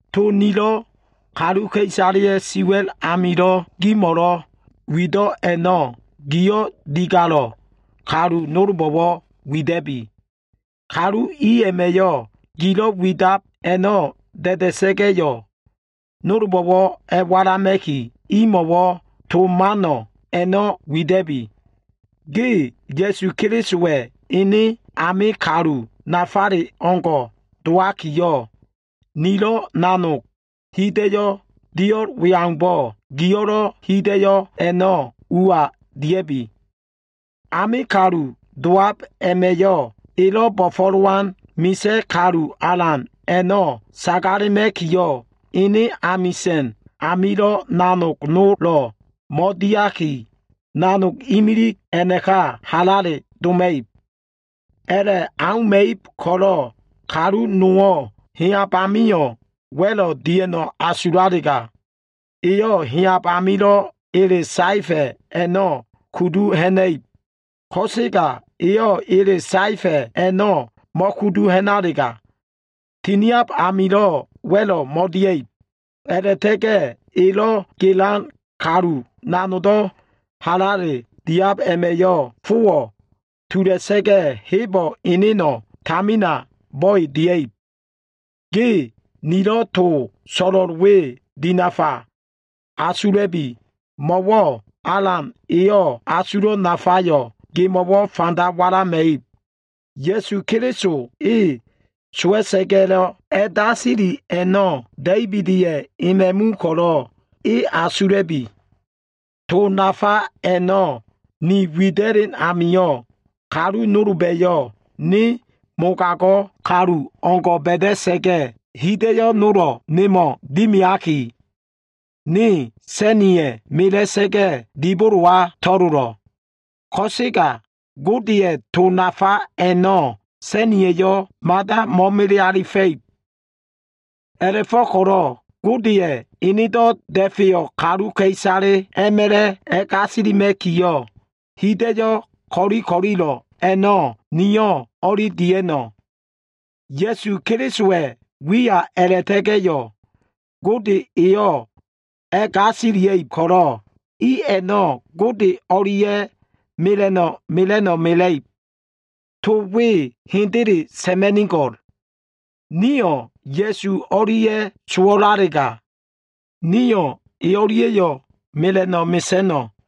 To nilo꞉ kaluka꞉isaleya꞉ siwa꞉l amilo꞉ gimo꞉lo꞉ wido꞉ a꞉no꞉, giyo꞉ digalo꞉ kalu nolbo꞉wo꞉ wida꞉bi. Kalu i a꞉ma꞉yo꞉ gilo꞉ widab a꞉no꞉ da꞉da꞉sa꞉ga꞉yo꞉ nolbo꞉wo꞉ a꞉walama꞉ki, imo꞉wo꞉ to man a꞉no꞉ wida꞉bi. Ge Ya꞉su Kelisowa꞉ ene ame kalu nafale o꞉ngo꞉ dowakiyo꞉, nilo꞉ nanog hida꞉yo꞉ dio꞉l we aumbo꞉, giyo꞉lo꞉ hida꞉yo꞉ a꞉no꞉ ua dia꞉bi. Ame kalu dowab a꞉ma꞉yo꞉, elo꞉ bo꞉fo꞉lowan misa꞉ kalu alan a꞉no꞉ sagalema꞉kiyo꞉, e amisa꞉n amilo꞉ nanog nolo꞉ mo꞉diaki, nanog imilig a꞉naka halale doma꞉ib. A꞉la꞉ auma꞉ib ko꞉lo꞉, kalu nowo꞉ heyab amio꞉ wa꞉lo꞉ dia꞉no꞉ asulalega, eyo꞉ heyab amilo꞉ ele saefa꞉ a꞉no꞉ kudu ha꞉na꞉ib. Ko꞉sega eyo꞉ ele saefa꞉ a꞉no꞉ mo꞉kudu ha꞉nalega, tiniab amio꞉ wa꞉lo꞉ mo꞉dia꞉ib. A꞉la꞉ta꞉ga꞉ elo꞉ gelan kalu nanogdo꞉ halale diab a꞉ma꞉yo꞉, fowo꞉ tula꞉sa꞉ga꞉, hebo꞉ eneno꞉ tamina bo꞉e dia꞉ib. Ge nilo꞉ to so꞉lo꞉l we dinafa asula꞉bi. Mo꞉wo꞉ Alan eyo꞉ asulo꞉ nafayo꞉ gemo꞉wo꞉ fanda walama꞉ib. Ya꞉su Keliso e sowa꞉sa꞉ga꞉lo꞉ a꞉dasili a꞉no꞉, Da꞉ibida꞉ ema꞉mu ko꞉lo꞉ e asula꞉bi. To nafa a꞉no꞉ ni wida꞉len amio꞉, kalu nolba꞉yo꞉ ne mogago꞉ kalu o꞉ngo꞉ ba꞉da꞉sa꞉ga꞉, hida꞉yo꞉ nolo꞉ nemo꞉ dimiaki, ne sa꞉niya꞉ mela꞉sa꞉ga꞉, dibolowa to꞉lolo꞉. Ko꞉sega Godeya꞉ to nafa a꞉no꞉ sa꞉niya꞉yo꞉ mada mo꞉mele alifa꞉ib. A꞉la꞉fo꞉ko꞉lo꞉ Godeya꞉ enedo꞉ da꞉feyo꞉ kaluka꞉isaleyo꞉ a꞉ma꞉la꞉ a꞉gasilima꞉kiyo꞉, hida꞉yo꞉ ko꞉li ko꞉lilo꞉ a꞉no꞉ niyo꞉ o꞉li dia꞉no꞉. Ya꞉su Kelisowa꞉ wiya a꞉la꞉ta꞉ga꞉yo꞉ Gode eyo꞉ a꞉gasilia꞉ib ko꞉lo꞉, i a꞉no꞉ Gode o꞉lia꞉ mela꞉no꞉ mela꞉no꞉ mela꞉ib. To we hendele sa꞉ma꞉nigo꞉l. Nio꞉ Ya꞉su o꞉lia꞉ sowo꞉lalega, Nio꞉ e o꞉lia꞉yo꞉ mela꞉no꞉ mesa꞉no꞉.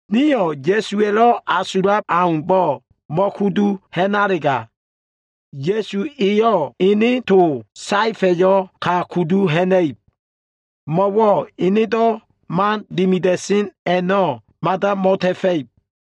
Nio꞉ Ya꞉suwa꞉lo꞉ asulab aumbo꞉ mo꞉kudu ha꞉nalega, Ya꞉su Eyo꞉ ene to saefa꞉yo꞉ ka kudu ha꞉na꞉ib. Mo꞉wo꞉ enedo꞉ man dimida꞉sen a꞉no꞉ mada mo꞉ta꞉fa꞉ib.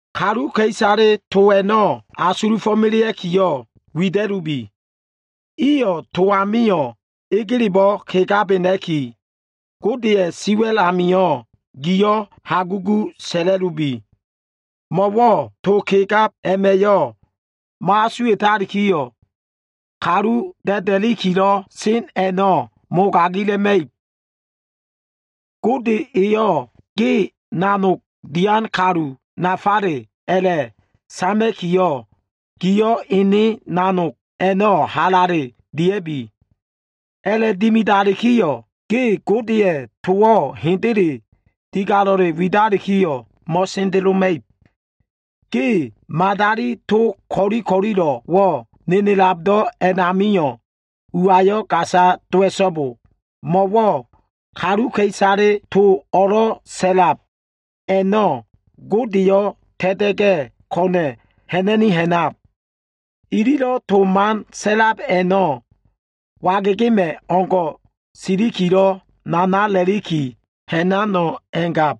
Kaluka꞉isaleyo꞉ to a꞉no꞉ asulufo꞉melea꞉kiyo꞉ wida꞉lubi. Iyo꞉ to amio꞉ egelebo꞉ kegabena꞉ki, Godeya꞉ siwa꞉l amio꞉ giyo꞉ hagugu sa꞉la꞉lubi. Mo꞉wo꞉ to kegab a꞉ma꞉yo꞉ mo꞉asuwa꞉talikiyo꞉, kalu da꞉da꞉likilo꞉ sen a꞉no꞉ mogagila꞉ma꞉ib. Gode eyo꞉ ge nanog dian kalu nafale a꞉la꞉sama꞉kiyo꞉, giyo꞉ ene nanog a꞉no꞉ halale dia꞉bi. A꞉la꞉dimidalikiyo꞉, ge Godeya꞉ towo꞉ hende digalo꞉le widalikiyo꞉ mo꞉sendeloma꞉ib. Ge madali to ko꞉li ko꞉lilo꞉wo꞉ nenelabdo꞉ a꞉namio꞉ uayo꞉ gasa dowa꞉so꞉bo. Mo꞉wo꞉ kaluka꞉isale to o꞉lo꞉ sa꞉lab a꞉no꞉ Godeyo꞉ ta꞉ta꞉ga꞉ ko꞉na꞉ ha꞉na꞉ni ha꞉nab. Ililo꞉ to man sa꞉lab a꞉no꞉, wagegema꞉ o꞉ngo꞉ silikilo꞉ nanala꞉liki ha꞉nano꞉ a꞉ngab.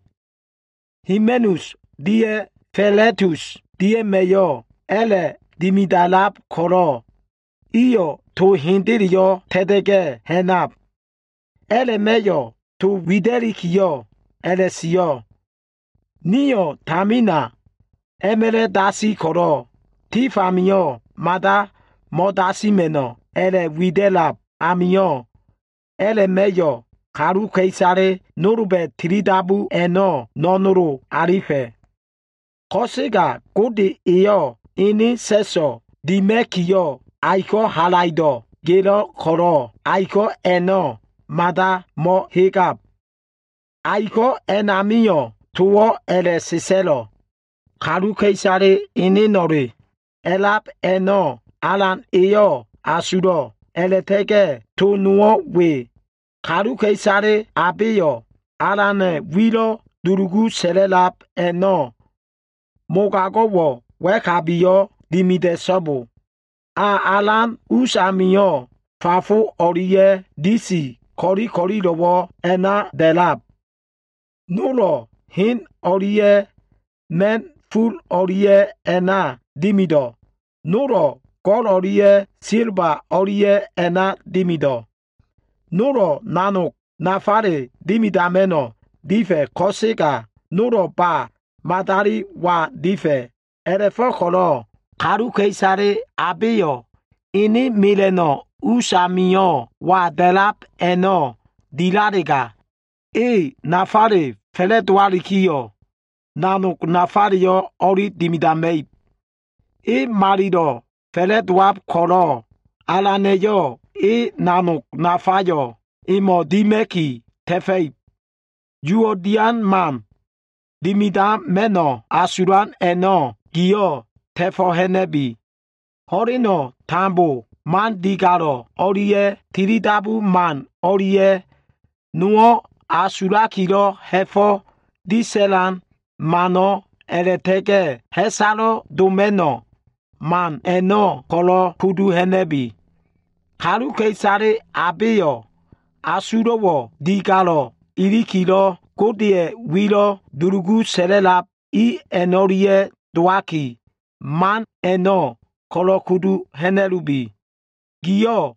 Himeneus dia꞉ Filetus dia꞉ma꞉yo꞉ a꞉la꞉dimida꞉lab ko꞉lo꞉, iyo꞉ to hendeleyo꞉ ta꞉ta꞉ga꞉ ha꞉nab. A꞉la꞉ma꞉yo꞉ to wida꞉likiyo꞉ a꞉la꞉sio꞉, “Nio꞉ tamina a꞉ma꞉la꞉ dasi ko꞉lo꞉ tif amio꞉ mada mo꞉dasima꞉no꞉” a꞉la꞉wida꞉lab amio꞉, a꞉la꞉ma꞉yo꞉ kaluka꞉isale nolba꞉lo꞉ tilidabu a꞉no꞉ no꞉nolo꞉ alifa꞉. Ko꞉sega Gode eyo꞉ ene sa꞉so꞉ dima꞉kiyo꞉, aiko꞉ halaido꞉ gelo꞉ ko꞉lo꞉, aiko꞉ a꞉no꞉ mada mo꞉hegema꞉ib. Aiko꞉ a꞉namio꞉ towo꞉ a꞉la꞉sa꞉sa꞉lo꞉, “Kaluka꞉isale eneno꞉le a꞉lab a꞉no꞉ Alan eyo꞉ asulo꞉.” A꞉la꞉ta꞉ga꞉ to nowo꞉ we, “Kaluka꞉isale abeyo꞉ Alana꞉ wilo꞉ dulugu sa꞉la꞉lab a꞉no꞉, mogago꞉wo꞉ wa꞉kabiyo꞉ dimida꞉so꞉bo.” A alan us amio꞉ fafo o꞉lia꞉ disi ko꞉li ko꞉lilo꞉wo꞉ a꞉na da꞉lab. Nolo꞉ hen o꞉lia꞉ ma꞉na꞉ ful o꞉lia꞉ a꞉na dimido꞉, nolo꞉ go꞉l o꞉lia꞉ silba o꞉lia꞉ a꞉na dimido꞉. Nolo꞉ nanog nafale dimidama꞉no꞉ difa꞉ ko꞉sega, nolo꞉ ba madali wa difa꞉. A꞉la꞉fo꞉ko꞉lo꞉ kaluka꞉isale abeyo꞉ ene mela꞉no꞉ us amio꞉ wa da꞉lab a꞉no꞉ dilalega, e nafale fa꞉la꞉dowalikiyo꞉, nanog nafaleyo꞉ o꞉li dimidama꞉ib. E malilo꞉ fa꞉la꞉dowab ko꞉lo꞉ Alana꞉yo꞉ ene nanog nafayo꞉ emo꞉ dima꞉ki ta꞉fa꞉ib. Uwo꞉ dian man dimidama꞉no꞉ asulan a꞉no꞉ giyo꞉ ta꞉fo꞉ ha꞉na꞉bi. Ho꞉leno꞉ tambo man digalo꞉ o꞉lia꞉ tilidabu man o꞉lia꞉, nowo꞉ asulakilo꞉ ha꞉fo꞉ disa꞉lan mano꞉ a꞉la꞉ta꞉ga꞉ ha꞉salo꞉ doma꞉no꞉ man a꞉no꞉ ko꞉lo꞉ kudu ha꞉na꞉bi. Kaluka꞉isale abeyo꞉ asulo꞉wo꞉ digalo꞉likilo꞉ Godeya꞉ wilo꞉ dulugu sa꞉la꞉lab i a꞉no꞉lia꞉ dowaki, man a꞉no꞉ ko꞉lo꞉ kudu ha꞉na꞉lubi. Giyo꞉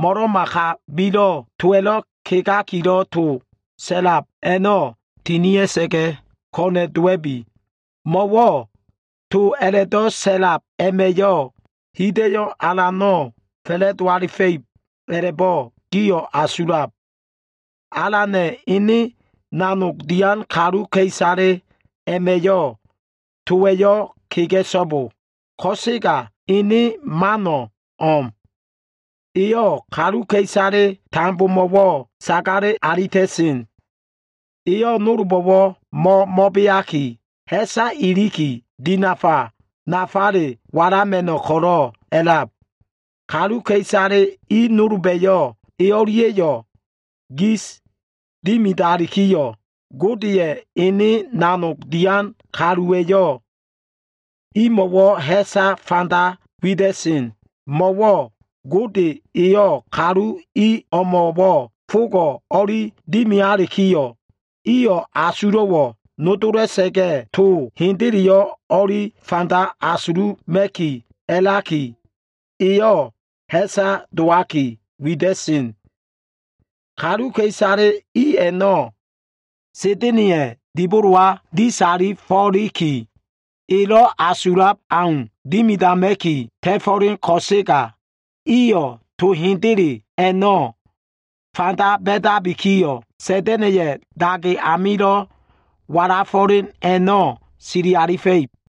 mo꞉lo꞉ma kabilo꞉ towa꞉lo꞉ kegakilo꞉ to sa꞉lab a꞉no꞉ tinia꞉sa꞉ga꞉ ko꞉na꞉ dowa꞉bi. Mo꞉wo꞉ to a꞉la꞉do꞉ sa꞉lab a꞉ma꞉yo꞉ hida꞉yo꞉ alano꞉ fa꞉la꞉do alifa꞉ib, a꞉la꞉bo꞉ giyo꞉ asulab. Alana꞉ ene nanog dian kaluka꞉isale a꞉ma꞉yo꞉ towa꞉yo꞉ kega꞉so꞉bo. Ko꞉sega ene mano꞉ o꞉m. Eyo꞉ kaluka꞉isale tambomo꞉wo꞉ sagale alita꞉sen. Eyo꞉ nolbo꞉wo꞉ mo꞉mo꞉beaki ha꞉sa iliki, dinafa nafale walama꞉no꞉ ko꞉lo꞉ a꞉lab. Kaluka꞉isale i nolba꞉yo꞉ e o꞉lia꞉yo꞉ gis dimidalikiyo꞉, Godeya꞉ ene nanog dian kaluwa꞉yo꞉ imo꞉wo꞉ ha꞉sa fanda wida꞉sen. Mo꞉wo꞉ Gode eyo꞉ kalu i o꞉mo꞉wo꞉ fogo꞉ o꞉li dimialikiyo꞉, iyo꞉ asulo꞉wo꞉ nodola꞉sa꞉ga꞉, to hendeleyo꞉ o꞉li fanda asuluma꞉ki a꞉laki, eyo꞉ ha꞉sa dowaki wida꞉sen. Kaluka꞉isale i a꞉no꞉ Sa꞉da꞉na꞉ya꞉ dibolowa disa꞉fo꞉liki, elo꞉ asulab au dimidama꞉ki ta꞉fo꞉len ko꞉sega, iyo꞉ to hendele a꞉no꞉ fanda ba꞉dabikiyo꞉, Sa꞉da꞉na꞉ya꞉ dage amilo꞉ walafo꞉len a꞉no꞉ sili alifa꞉ib.